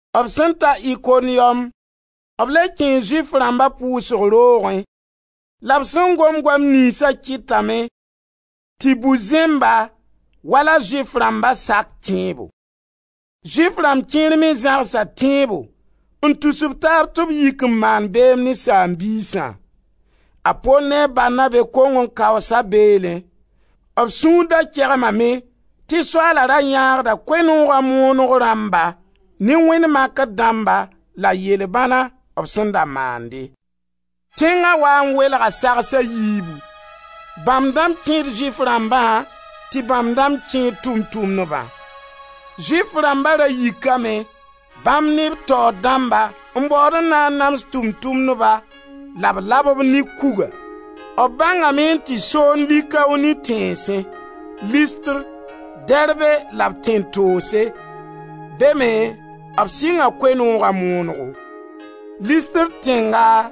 B sẽn ta Ikoniyom, b le kẽe Zʋɩf rãmba pʋʋsg roogẽ la b sẽn gom goam niynsa kɩtame tɩ bu-zẽmba, wala Zʋɩf rãmba, sak tẽebo. Zʋɩf rãmb kẽer me zãgsa tẽebo n tus b taab tɩ b yik n maand beem ne saam-biisã. A Pol ne a Barnabe kong n kaoosa beelẽ. B sũur da kegmame tɩ Soaala ra yãagda Koe-nooga moonego rãmba ne wẽnd makr dãmba la yel-bãna b sẽn da maande. Tẽnga waa n welga sags a yiibu: bãmb dãmb kẽed Zʋɩf rãmbã tɩ bãmb dãmb kẽed Tʋʋm-tʋmdbã. Zʋɩf rãmba ra yikame, bãmb ne b taoor dãmba n baood n na n nams Tʋʋm-tʋmdba la b lab-b ne kuga. B bãngame n tɩ soond Likaoni tẽnsẽ: Listr, Derbe la b tẽn-toose. Be me b sɩnga Koe-nooga moonego. Listr tẽnga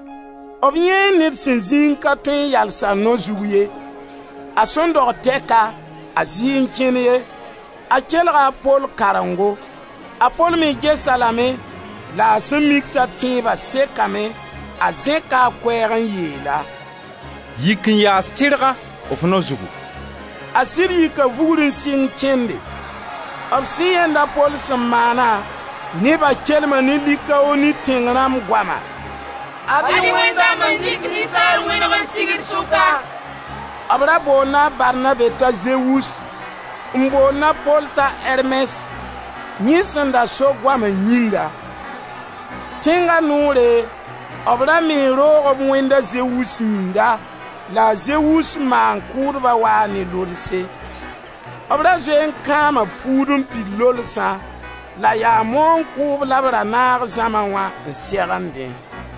b yãee ned sẽn zĩ n ka tõe n yals a nao zug ye. A sẽn dog tɛka a zɩɩ n kẽn ye. A kelga a Pol karengo. A Pol me ges-a lame la a sẽn mik t'a tẽeba sekame, a zẽka a koɛɛg n yeel-a: «Yik n yaas tɩrga f nao zugu!» A sɩd yika vugr n sɩng kẽnde. B sẽn yãenda Pol sẽn maana, neba kelma ne Likaoni tẽng rãmb goama: «Ad-y wẽnd dãmb n dɩk ninsaal wẽneg n sig d sʋka!» B ra boonda a Barnabe t'a Zewus, n boond a Pol t'a Ermɛs, yẽ sẽn da so goama yĩnga. Tẽnga noore, b ra mee roog b wẽnd a Zewus yĩnga la a Zewus maan-kʋʋdba waa ne lolse. B ra zoe n kãama puud n pid lolsã la yaa maoong kʋʋb la b ra naag zãma wã n segendẽ.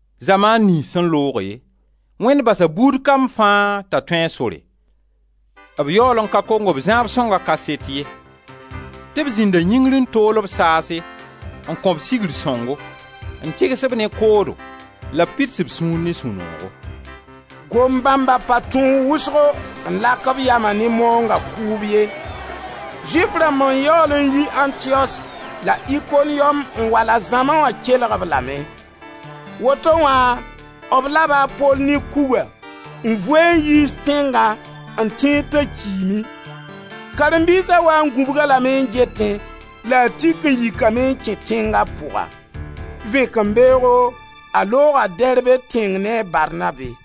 Zamaan niyns sẽn looge Wẽnd basa buud kam fãa t'a tũ a sore; b yaool ka kong b zãab sõnga kaset ye tɩ b zĩnda yĩngr n tool-b saase, n kõ-b sigr sõngo, n tɩgs-b ne koodo la b pids b sũur ne sũ-noogo.» Gom bãmba pa tõog wʋsgo n lak b yama ne maoonga kʋʋb ye. Zʋɩf rãmb n yaool n yi Antiyos la Ikoniyom n wa la zãma wã kelg-b lame. Woto wã b laba a Pol ne kuga n vu-a n yiis tẽngã, n tẽed t'a kiime. Karen-biisa waa n gũbg-a lame n getẽ la a tik n yikame n kẽ tẽnga pʋga. Vẽkembeoogo a looga Derbe tẽng ne a Barnabe.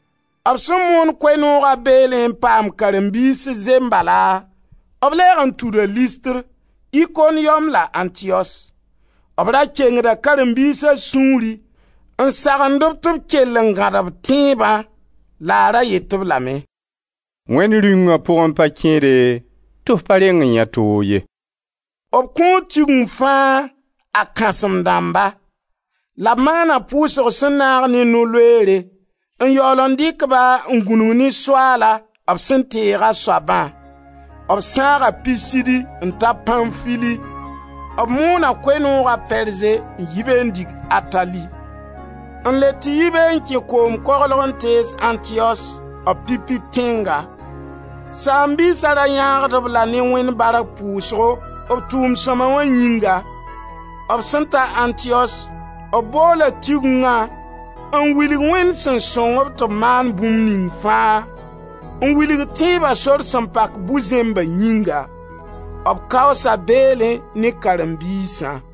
B sẽn moon Koe-nooga beelẽ n paam karen-biis zembala, b lɛɛg n tuda Listr, Ikoniyom la Antiyos. B ra kengda karen-biisa sũuri n sagend-b tɩ b kell n gãd b tẽebã la a ra yet-b lame: «Wẽnd Rĩunga pʋgẽ pa kẽede tɩ f pa reng n yãe toog ye.» B kõo Tigeng fãa a kãsem-dãmba. La b maana pʋʋsg sẽn naag ne no-loeere, n yaool n dɩk-ba n gũnug ne Soaala b sẽn teeg a soabã. B sãaga Pisidi n ta Pãnfili, b moona Koe-nooga Perze n yi be n dig Atali, n le tɩ yi be n kẽ koom koglg n tees Antiyos, b pipi tẽnga. Saam-biisa ra yãagd-b la ne Wẽnd bark pʋʋsgo b tʋʋm sõma wã yĩnga. B sẽn ta Antiyos b boola Tigengã n wilg Wẽnd sẽn sõng-b tɩ b maan bũmb ning fãa, n wilg tẽeba sor sẽn pak bu-zẽmba yĩnga. B kaoosa beelẽ ne karen-biisã.